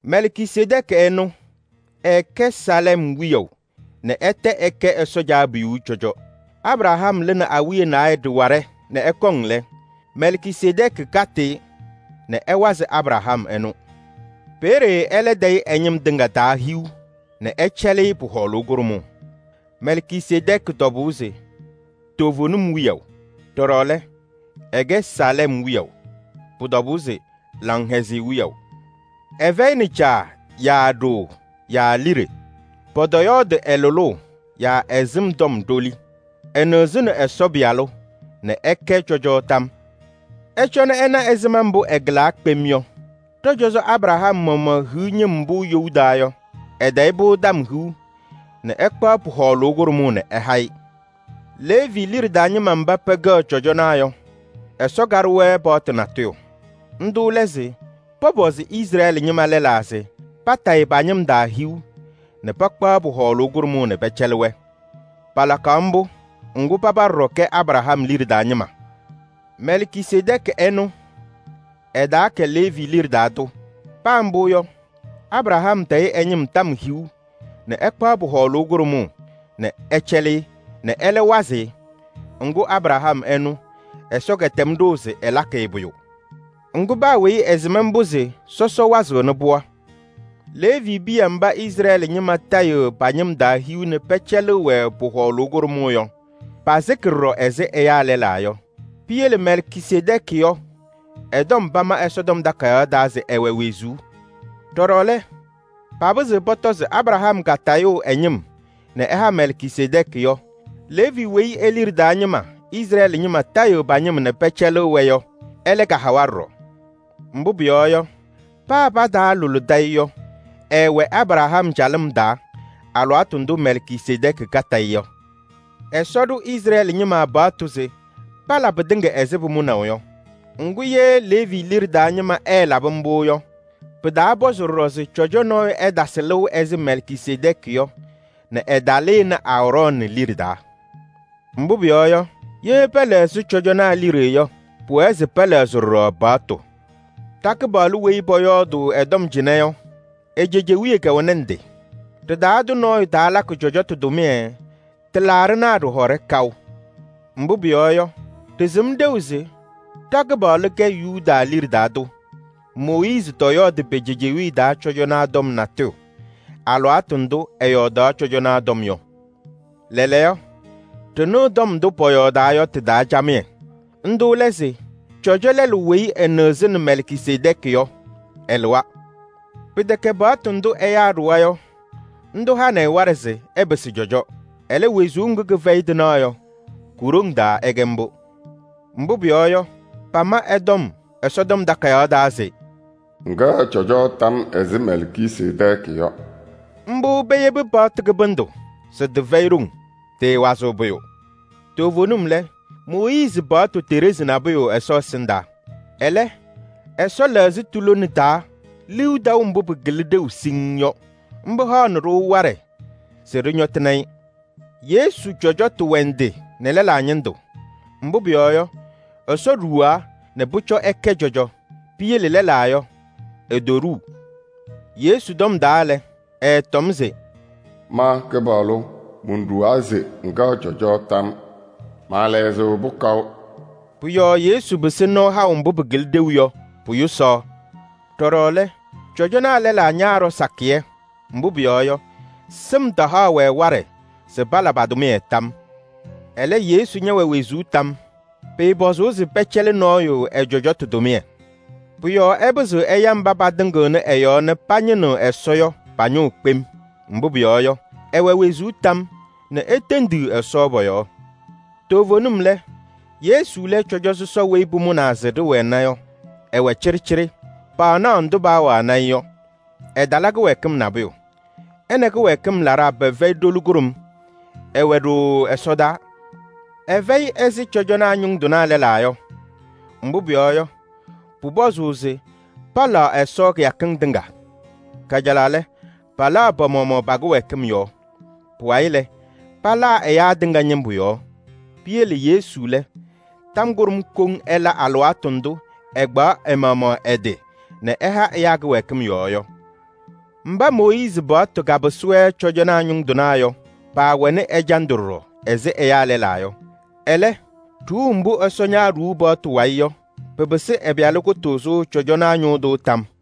Mɛlkisedɛɛkɩ ɛnʋ, ɛɛkɛ Saalɛm wiyaʋ nɛ ɛtɛ ɛkɛ Ɛsɔ Caabiyuu cɔjɔ. Abraham lɩnɩ awiya naayɛ ɖɩwaɖɛ nɛ ɛkɔŋ lɛ, Mɛlkisedɛɛkɩ katɩ-ɩ nɛ ɛwazɩ Abraham ɛnʋ ɛ-yɔɔ. Peeye ɛlɛ tayɩ ɛ-ñɩm tɩŋa tɔm hiu nɛ ɛcɛlɩ-ɩ pʋ-hɔɔlʋʋ kʋɖʋmʋʋ. Mɛlkisedɛɛkɩ tɔbʋʋ se: “Toovenim wiyaʋ.” Ɖɔɖɔ lɛ, ɛkɛ Saalɛm wiyaʋ. Pʋbʋ tɔbʋʋ se: “Laŋhɛzɩyɛ wiyaʋ.” Ɛfɛyɩnɩ caa yaa ɖoo yaa liɖe. Pɔtɔyɔɔdɩ ɛ-lʋlʋʋ yaa ɛ-sɩm tɔm ɖoli. Ɛnɩɣzɩnɩ Ɛsɔ Pɩyalʋ nɛ ɛkɛ cɔjɔ tam yɔɔ. Ɩcɔnɩ ɩna ɛzɩma mbʋ ɛkɩlaa kpem yɔ! Ɖɔ-cɔzɔ Abraham maɣmaɣ hiɣ ñɩm mbʋ you taa yɔ, ɛtayɩ-pʋ tɔm hiu nɛ ɛkpaɣ pʋ-hɔɔlʋʋ kʋɖʋmʋʋ nɛ ɛha-ɩ. Leevi liɖe taa ñɩma mba pɛkɛɣ cɔjɔnaa yɔ, Ɛsɔ kaɖʋ-wɛ paɣtʋ natʋyʋ. Ndʋ lɛ se pɔpɔzɩ Izrɛɛlɩ ñɩma lɛlaa se patayɩ pa-ñɩm tɔm hiu nɛ pakpaɣ pʋ-hɔɔlʋʋ kʋɖʋmʋʋ nɛ pɛcɛlɩ-wɛ. Palakaɣ mbʋ, ŋgʋ paba ɖɔɖɔ kɛ Abraham liɖe taa ñɩma. Mɛlkisedɛɛkɩ ɛnʋ, ɛtaakɛ Leevi liɖe taa tʋ. Paa mbʋ yɔ, Abraham tayɩ ɛ-ñɩm tɔm hiu nɛ ɛkpaɣ pʋ-hɔɔlʋʋ kʋɖʋmʋʋ nɛ ɛcɛlɩ-ɩ nɛ ɛlɛ wazɩ ɛ-yɔɔ. Ŋgʋ Abraham ɛnʋ, Ɛsɔ kɛtɛm ɖʋʋ se ɛlakɩ-ɩ pʋyʋ. Ŋgʋ, paa weyi ɛsɩm mbʋ se sɔsɔ wazɩɣnɩ pɩɣa yɔɔ. Leevi piya mba Izrɛɛlɩ ñɩma tayɩɣ pa-ñɩm tɔm hiu nɛ pɛcɛlɩɣ-wɛ pʋ-hɔɔlʋʋ kʋɖʋmʋʋ yɔ, pasɩkɩ ɖɔɖɔ ɛzɩ ɛyaa lɛlaa yɔ. Piyele Mɛlkisedɛɛkɩ yɔ, ɛ-tɔm pama Ɛsɔtɔm Takayaɣ taa se ɛwɛ wezuu. Pɩtɛ, papɩzɩɣ pɔtɔ se Abraham katayʋʋ ɛ-ñɩm nɛ ɛha Mɛlkisedɛɛkɩ yɔ, Leevi weyi e-liɖe taa ñɩma Izrɛɛlɩ ñɩma tayɩɣ pa-ñɩm nɛ pɛcɛlɩɣ-wɛ yɔ, ɛlɛ kahawa ɖɔɖɔ. Mbʋ pʋyɔɔ yɔ, paa pataalʋlɩdɩ-ɩ yɔ, ɛɛwɛ Abraham calɩm taa alɩwaatʋ ndʋ Mɛlkisedɛɛkɩ katɩ-ɩ yɔ. Ɛsɔ ɖʋ Izrɛɛlɩ ñɩma paɣtʋ se pala pɩtɩŋa ɛzɩ pʋmʋnaʋ yɔ. Ŋgʋ, ye Leevi liɖe taa ñɩma ɛɛlabɩ mbʋ yɔ, pɩtaapɔzɩ ɖɔɖɔ se cɔjɔ nɔɔyʋ ɛtasɩ lɩʋ ɛzɩ Mɛlkisedɛɛkɩ yɔ nɛ ɛtalɩnɩ Aarɔɔnɩ liɖe taa. Mbʋ pʋyɔɔ yɔ, ye pɛlɛɣzɩ cɔjɔnaa liɖe yɔ, pʋwɛɛ se pɛlɛɣzɩ ɖɔɖɔ paɣtʋ. Ɖa-Kɩpaɣlʋ weyi pɔyɔɔdʋʋ ɛ-tɔm cɩnɛ yɔ, e-cejewiye kɛwɛnɩ ndɩ. Ɖɩ-taa tʋ nɔɔyʋ taalakɩ cɔjɔtʋ tʋmɩyɛ tɩlaaɖɩnaa ɖɩhɔɖɛ kaʋ. Mbʋ pʋyɔɔ yɔ, ɖɩsɩm ɖeu se ɖa-Kɩpaɣlʋ kɛ Yuda liɖe taa tʋ. Mooyiizi tɔyɔɔdɩ pe-cejewiye taa cɔjɔnaa tɔm natʋyʋ alɩwaatʋ ndʋ ɛyɔɔdaɣ cɔjɔnaa tɔm yɔ. Lɛɛlɛɛyɔ ɖɩnɩɣ tɔm ndʋ pɔyɔɔdaa yɔ tɩ-taa camɩyɛ: ndʋ lɛ se cɔjɔ lɛlʋ weyi ɛnɩɣzɩnɩ Mɛlkisedɛɛkɩ yɔ, ɛlɩwa. Pɩtɛkɛ paɣtʋ ndʋ ɛyaa ɖʋwa yɔ tɩhanɩ-ɩ waɖɛ se ɛpɩsɩ cɔjɔ. Ɛlɛ, wezuu ŋgʋ kɩfɛyɩ tɩnaɣ yɔ, ku-ɖoŋ taa ɛkɛ mbʋ. Mbʋ pʋyɔɔ yɔ, pama ɛ-tɔm Ɛsɔtɔm Takayaɣ taa se: “Ŋkɛɣ cɔjɔ tam yɔɔ ɛzɩ Mɛlkisedɛɛkɩ yɔ.” Mbʋ peyebi paɣtʋ kɩbɩndʋ se tɩfɛyɩ ɖoŋ, tɩɩwazɩɣ pʋyʋ. Toovenim lɛ, Mooyiizi paɣtʋ teɖezi nabʋyʋ Ɛsɔ ɛsɩndaa. Ɛlɛ, Ɛsɔ lɛɣzɩ tu-lone taa liu taʋ mbʋ pɩkɩlɩ-tʋ ɖeu siŋŋ yɔ. Mbʋ haɣnɩ-ɖʋ waɖɛ se ɖɩñɔtɩnɩ-ɩ. Yesu cɔjɔtʋ wɛ ndɩ nɛ lɛlaa ñɩndʋ. Mbʋ pʋyɔɔ yɔ, Ɛsɔ ɖuwaa nɛ pʋcɔ ɛkɛ cɔjɔ. Piyele lɛlaa yɔ, etoɖuu. Yesu tɔm taa lɛ, ɛɛtɔm se: “Ma Kɩpaɣlʋ monɖuwaa se: ‘ŋkɛɣ cɔjɔ tam yɔɔ.’ Maalɛɣzɩɣ-pʋ kaʋ.” Pʋ-yɔɔ Yesu pɩsɩ nɔɔ haʋ mbʋ pɩkɩlɩ ɖeu yɔ pʋ-yʋsaɣ. Ɖɔɖɔ lɛ, cɔjɔnaa lɛlaa ñaaɖɔ sakɩyɛ, mbʋ pʋyɔɔ yɔ, sɩm tahaɣ-wɛ waɖɛ se pala pa-tʋmɩyɛ tam yɔɔ. Ɛlɛ, Yesu ñɛwɛ wezuu tam yɔɔ. Pɩɩpɔzʋʋ se pɛcɛlɩ nɔɔyʋ ɛ-cɔjɔtʋ tʋmɩyɛ. Pʋ-yɔɔ ɛpɩzɩɣ ɛya mba patɩŋɩɣnɩ ɛ-yɔɔ nɛ pañɩnɩɣ Ɛsɔ yɔ pa-ñʋʋ kpem. Mbʋ pʋyɔɔ yɔ, ɛwɛ wezuu tam yɔɔ nɛ etendiɣ Ɛsɔ pɔ-yɔɔ. Toovenim lɛ, Yesu lɛ cɔjɔ sɔsɔ weyi pʋmʋnaa se ɖɩwɛna yɔ: ɛwɛ cɩɖɩcɩɖɩ, paanaɣ ndʋ paawanɩ-ɩ yɔ, ɛtala kɩwɛɛkɩm nabʋyʋ. Ɛ nɛ kɩwɛɛkɩm laɖaa pɛfɛyɩ ɖoli kʋɖʋm, ɛwɛ ɖooo ɛsɔdaa. Ɛfɛyɩ ɛzɩ cɔjɔnaa ñʋŋ tɩnaa lɛlaa yɔ. Mbʋ pʋyɔɔ yɔ, pʋpɔzʋʋ se palaɣ Ɛsɔ kɩyakɩŋ tɩŋa. Kajalaɣ lɛ, palaɣ pa-maɣmaɣ pa-kɩwɛɛkɩm yɔɔ. Pʋwayɩ lɛ, palaa ɛyaa tɩŋa ñɩmbʋ yɔɔ. Piyele Yesu lɛ, tɔm kʋɖʋm koŋ ɛla alɩwaatʋ ndʋ ɛkpaɣ ɛ-maɣmaɣ ɛ-tɩ nɛ ɛha ɛyaa kɩwɛɛkɩm yɔɔ yɔ. Mba Mooyiizi paɣtʋ kapɩsɩ-wɛ cɔjɔnaa ñʋŋ tɩnaa yɔ, paawɛnɩ ɛjandʋ ɖɔɖɔ ɛzɩ ɛyaa lɛlaa yɔ. Ɛlɛ, ɖuuu mbʋ Ɛsɔ ñaaɖuu paɣtʋ wayɩ yɔ, pɩpɩsɩ ɛ-Pɩyalʋ kʋtʋʋzʋ cɔjɔnaa ñʋʋ tʋ tam yɔɔ.